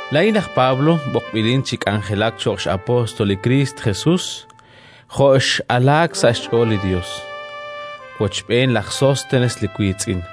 Laa'in laj Pablo, b'oqb'ilin chi k'anjelak cho'q x'apóstol li Kristo Jesus jo' x'alaak sa' xch'ool li Yos, wochb'een laj Sóstenes li wiitz'in,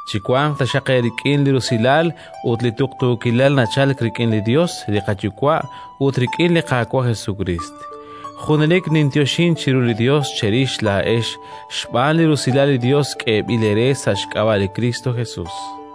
Chiwanq taxaq eerik'in li usilal ut li tuqtuukilal nachalk rik'in li Yos li qaYuwa' ut rik'in li Qaawa' Jesukriist. Junelik ninyoxink chiru li Yos cherix laa'ex xb'aan li rusilal li Yos k'eeb'il eere sa' xk'ab'a' li Kristo Jesus,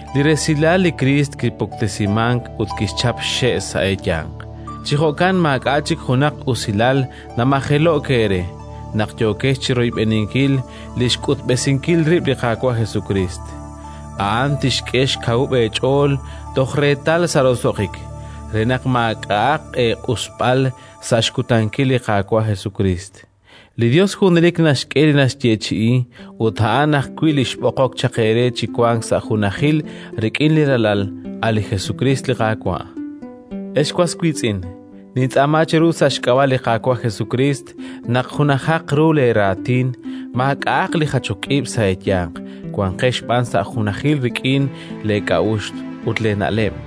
Li resilal li Kriist kipuktesimank ut kixchap xxe' sa' eeyanq. Chi jo'kan maak'a' chik junaq usilal namajelo'k eere naq yookex chi royb'eninkil li xk'utb'esinkil rib' li Qaawa' Jesukriist. A'an tixk'e xkawub' eech'ool toj reetal sa' roso'jik, re naq maak'a'aq eeq'usb'al sa' xkutankil li Qaawa' Jesukriist. Li Yos junelik naxk'e li naxyeechi'i, ut a'an ajwi' li xb'oqok chaq eere chi wank sa' junajil rik'in li Ralal, a' li Jesukriist li Qaawa'. Ex was wiitz'in, nintz'aama cheru sa' xk'ab'a' li Qaawa' Jesukriist naq junajaq ru leeraatin, maak'a'aq li jachok ib' sa' eeyanq, wanqex b'an sa' junajil rik'in leek'a'uxl ut leena'leb'.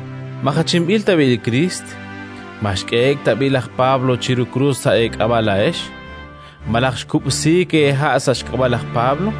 Ma jachinb'il tab'i' li Kriist? Ma xk'ehe'k tab'i' laj Pablo chiru krus sa' eek'ab'a' laa'ex? Malaj xkub'siik eeha' sa' xk'ab'a' laj Pablo?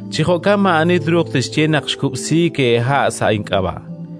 Chi jo'kan maa'ani truuq tixye naq xkub'siik eeha' sa' ink'ab'a'.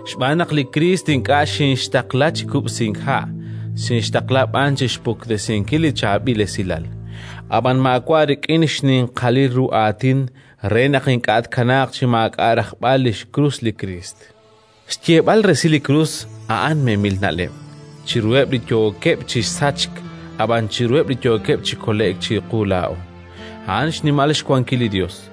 Xb'aan naq li Kriist ink'a' xinxtaqla chi kub'sink ha', xinxtaqla b'an chi xpuktesinkil li Chaab'il Esilal. Ab'an maawa' rik'in xninqalil ru aatin, re naq ink'a' tkanaaq chi maak'a' rajb'al li xkrus li Kriist. Xyeeb'al resil li krus a'an memil na'leb' chiruheb' li yookeb' chi sachk, ab'an chiruheb' li yookeb' chi kole'k -chiqu laa'o- a'an xnimal xwankil li Yos.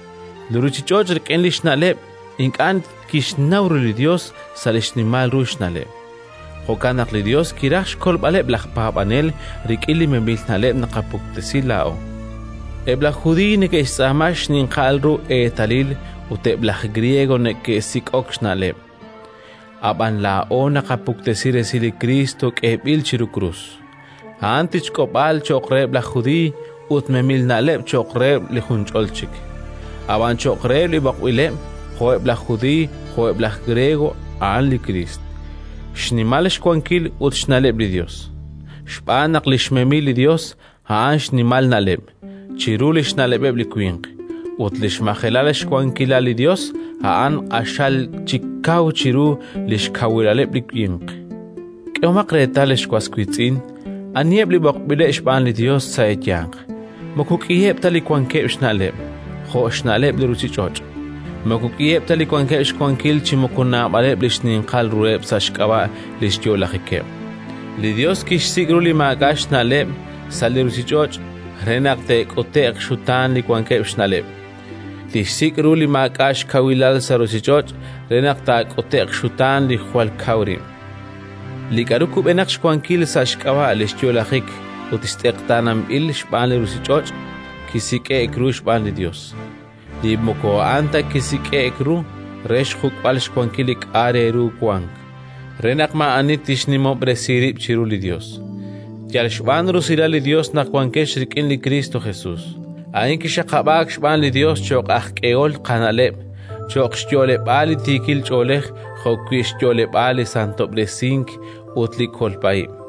Li ruuchich'och' rik'in li xna'leb' ink'a' kixnaw ru li Yos sa' li xnimal ru xna'leb'; jo'kan naq li Yos kiraj xkolb'aleb' laj paab'anel rik'in li memil na'leb' naqapuktesi laa'o. Eb' laj Judiiy neke'xtz'aama xninqal ru eetalil ut eb' laj Griego neke'sik'ok na'leb'; ab'an laa'o naqapuktesi resil li Kriist k'eeb'il chiru krus. A'an tichk'ob'aal cho'q reheb' laj Judiiy ut memil na'leb' cho'q reheb' li junch'ol chik, ab'an cho'q reheb' li b'oqb'ileb', jo'eb' laj Judiiy jo'eb' laj Griego, a'an li Kriist, xnimal xwankil ut xna'leb' li Yos. Xb'aan naq li xmemil li Yos a'an xnimal na'leb' chiru li xna'leb'eb' li winq, ut li xmajelal xkawilal li Yos a'an q'axal chik kaw chiru li xkawilaleb' li winq. K'ehomaq reetal, ex was wiitz'in, aniheb' li b'oqb'ileb' xb'aan li Yos sa' eeyanq: moko k'iheb' ta li wankeb' xna'leb' jo' xna'leb' li ruuchich'och'; moko k'iheb' ta li wankeb' xwankil chi moko naab'aleb' li xninqal ruheb' sa' xk'ab'a' li xyo'lajikeb'. Li Yos kixsik' ru li maak'a' xna'leb' sa' li ruuchich'och' re naq te'k'ute'q xxutaan li wankeb' xna'leb'; kixsik' ru li maak'a' xkawilal sa' ruuchich'och' re naq taak'ute'q xxutaan li jwal kaw rib'. Li k'aru kub'enaq xwankil sa' xk'ab'a' li xyo'lajik ut tz'eqtaananb'il xb'aan li ruuchich'och' kisik'e'k ru xb'aan li Yos: li moko a'an ta kisik'e'k ru, re xjuk'b'al xwankil li k'a' re ru wank, re naq maa'ani tixnimob'resi rib' chiru li Yos. Yal xb'aan rusilal li Yos naq wankex rik'in li Kristo Jesus: a'in kixaqab'aak xb'aan li Yos cho'q aj k'ehol qana'leb', cho'q xyo'leb'aal li tiikil ch'oolej jo'wi' xyo'leb'aal li santob'resink ut li kolb'a ib',